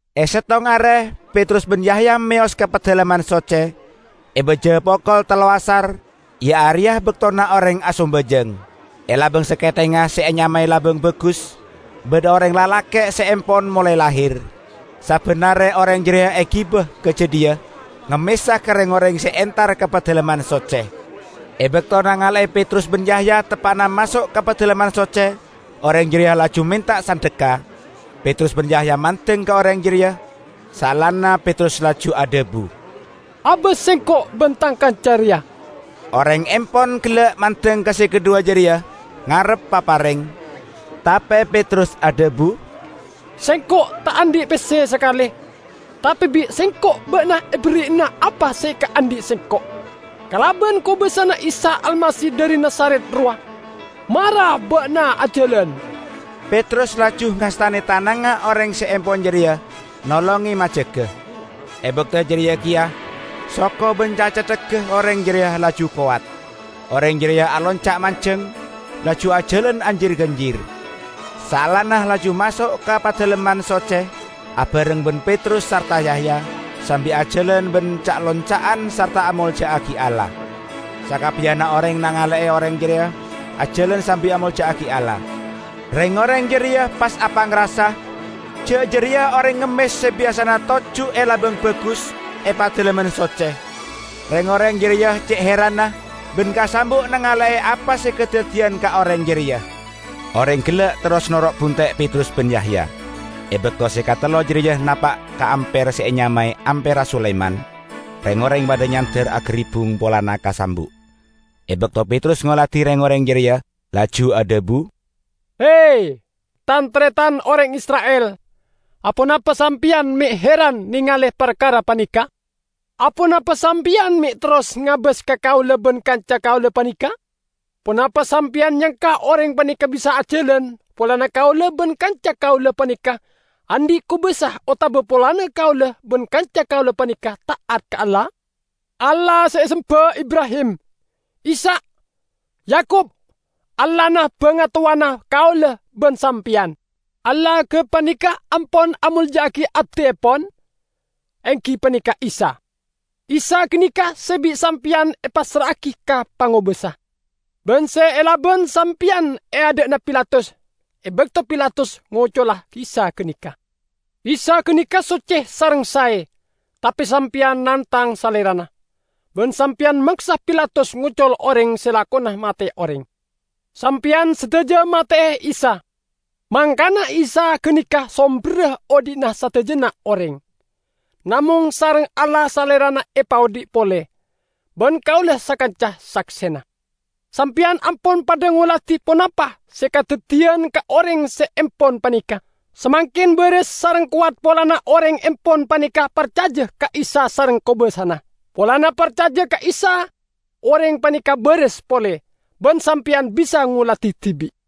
E settong are Petrus ban Yahya meyos ka Padalemman Socce, e baja pokol tello' asar, iya areya baktona oreng asambajang. E labang saketheng se enyamae "Labang Bagus", badha oreng lalake' se empon molae lahir. Sabban are oreng jareya egiba ka jadhiya, ngemmesa ka reng-oreng se entar ka Padalemman Socce. E bakto nangale'e Petrus ban Yahya teppa'na maso' ka Padalemman Socce, oreng jareya laju menta sandhekka. Petrus ban Yahya mandeng ka oreng jareya, saellana Petrus laju adhabu, "Abas sengko' ban tang kanca reya!" Oreng empon gella' mandeng ka se kadhuwa jareya, ngarep papareng. Tape Petrus adhabu, "Sengko' ta' andhi' pesse sakale. Tape bi' sengko' ba'na eberri'ana apa se ekaandhi' sengko': Kalaban kobasana Isa Almasih dhari Nazaret rowa, mara ba'na ajalan!" Petrus laju ngastane tanangnga oreng se empon jareya, nolonge majaga. E bakto jareya keya soko ban cacetthegga oreng jareya laju kowat. Oreng jareya alonca' manjeng, laju ajalan ajar-ganjir. Saellana laju maso' ka Padalemman Socce abareng ban Petrus sarta Yahya, sambi ajalan ban ca'-lonca'an sarta amolja'agi Allah. Sakabbiyanna oreng nangale'e oreng jareya ajalan sambi amolja'agi Allah. Reng-oreng jareya pas apangrasa ja' jareya oreng ngemmes se biyasana toju' e "Labang Bagus" e Padalemman Socce. Reng-oreng jareya ce' heranna ban kasambu' nangale'e apa se kadaddiyan ka oreng jareya. Oreng gella' terros noro' bunte' Petrus ban Yahya. E bakto se katello jareya napa' ka amper se enyamae "Amperra Sulaiman", reng-oreng padha nyander agaribbung polana kasambu'. E bakto Petrus ngoladi reng-oreng jareya, laju adhabu, "He, tan-taretan oreng Isra'il, aponapa sampeyan me' heran nengale parkara paneka? Aponapa sampeyan me' terros ngabas ka kaula ban kanca kaula paneka? Ponapa sampeyan nyangka oreng paneka bisa ajalan polana kaula ban kanca kaula paneka andhi' kobasa otaba polana kaula ban kanca kaula paneka ta'at ka Allah? Allah se esemba Ibrahim, Ishak, Yakub, Allahna bangatowana kaula ban sampeyan, Allah gapaneka ampon amolja'agi Abdiepon, enggi paneka Isa. Isa ganeka se bi' sampeyan epassra'agi ka pangobasa, ban se elaban sampeyan e adha'na Pilatus, e bakto Pilatus ngocola Isa ganeka. Isa ganeka socce sareng sae tape sampeyan nangtang Salerana, ban sampeyan maksa Pilatus ngocol oreng se lakona mate'e oreng. Sampeyan sadaja mate'e Isa, mangkana Isa ganeka somberra odhi'na sadajana oreng. Namong sareng Allah Salerana epaodhi' pole, ban kaula sakanca saksena. Sampeyan ampon padha ngoladi ponapa se kadaddiyan ka oreng se empon paneka. Samangken baras sareng kowat polana oreng empon paneka parcaja ka Isa sareng kobasana. Polana parcaja ka Isa oreng paneka baras pole, ban sampeyan bisa ngoladi dibi'.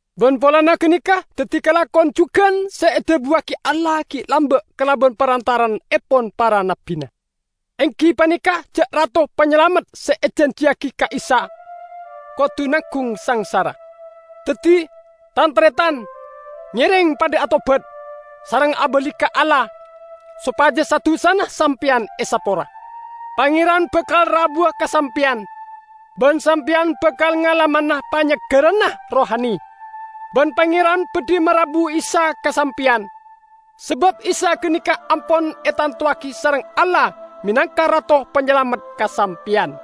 Ban polana ganeka daddi kalakon jugan se edhabuwagi Allah gi' lamba' kalaban parantara'annepon para nabbina, enggi paneka ja' Rato Panyalamet se ejanjiyagi ka'issa' kodu nanggung sangsara. Daddi, tan-taretan, ngereng padha atobat, sareng abali ka Allah, sopaja sa-dusana sampeyan esapora. Pangeran bakal rabuwa ka sampeyan, ban sampeyan bakal ngalamana panyeggerranna rohani. Ban Pangeran badhi marabu Isa ka sampeyan, sabab Isa ganeka ampon etantowagi sareng Allah menangka Rato Panyalamet ka sampeyan.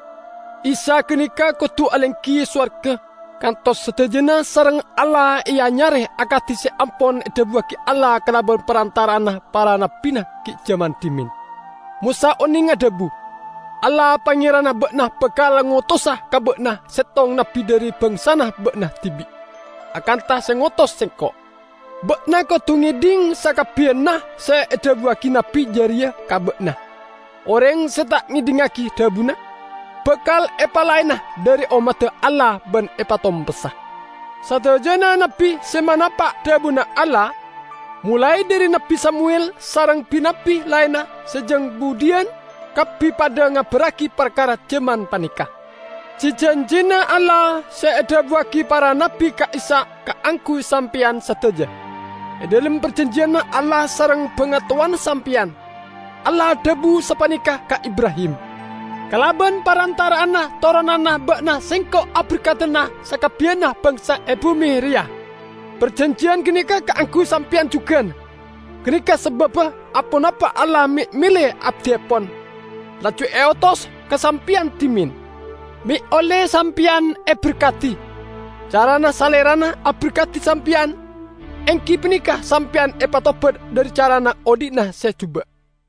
Isa ganeka kodu alenggi e sowarga kantos sadajana sareng Allah eanyare akadi se ampon edhabuwagi Allah kalaban parantara'anna para nabbina gi' jaman dhimen. Mosa oneng adhabu, 'Allah Pangeranna ba'na bakal ngotosa ka ba'na settong nabbi dhari bangsana ba'na dibi', akantha se ngotos sengko'. Ba'na kodu ngedhing sakabbiyanna se edhabuwagi nabbi jareya ka ba'na. Oreng se ta' ngedhingngagi dhabuna, bakal epalaena dhari ommadda Allah ban epatompessa.' Sadajana nabbi se manapa' dhabuna Allah, molae dhari Nabbi Samuwel sareng bi-nabbi laenna se jang budhiyan, kabbi padha ngabarragi parkara jaman paneka. Ji-janjina Allah se edhabuwagi para nabbi ka'issa' kaangguy sampeyan sadaja. E dhalem parjanjiyanna Allah sareng bangatowana sampeyan, Allah adhabu sapaneka ka Ibrahim, 'Kalaban parantara'anna toronanna ba'na Sengko' aberkadana sakabbiyanna bangsa e bume reya.' Parjanjiyan ganeka kaangguy sampeyan jugan. Ganeka sababba aponapa Allah me' mele Abdiepon, laju eotos ka sampeyan dhimen, me' olle sampeyan eberkadi. Carana Salerana aberkadi sampeyan, enggi paneka sampeyan epatobat dhari carana odhi'na se juba'."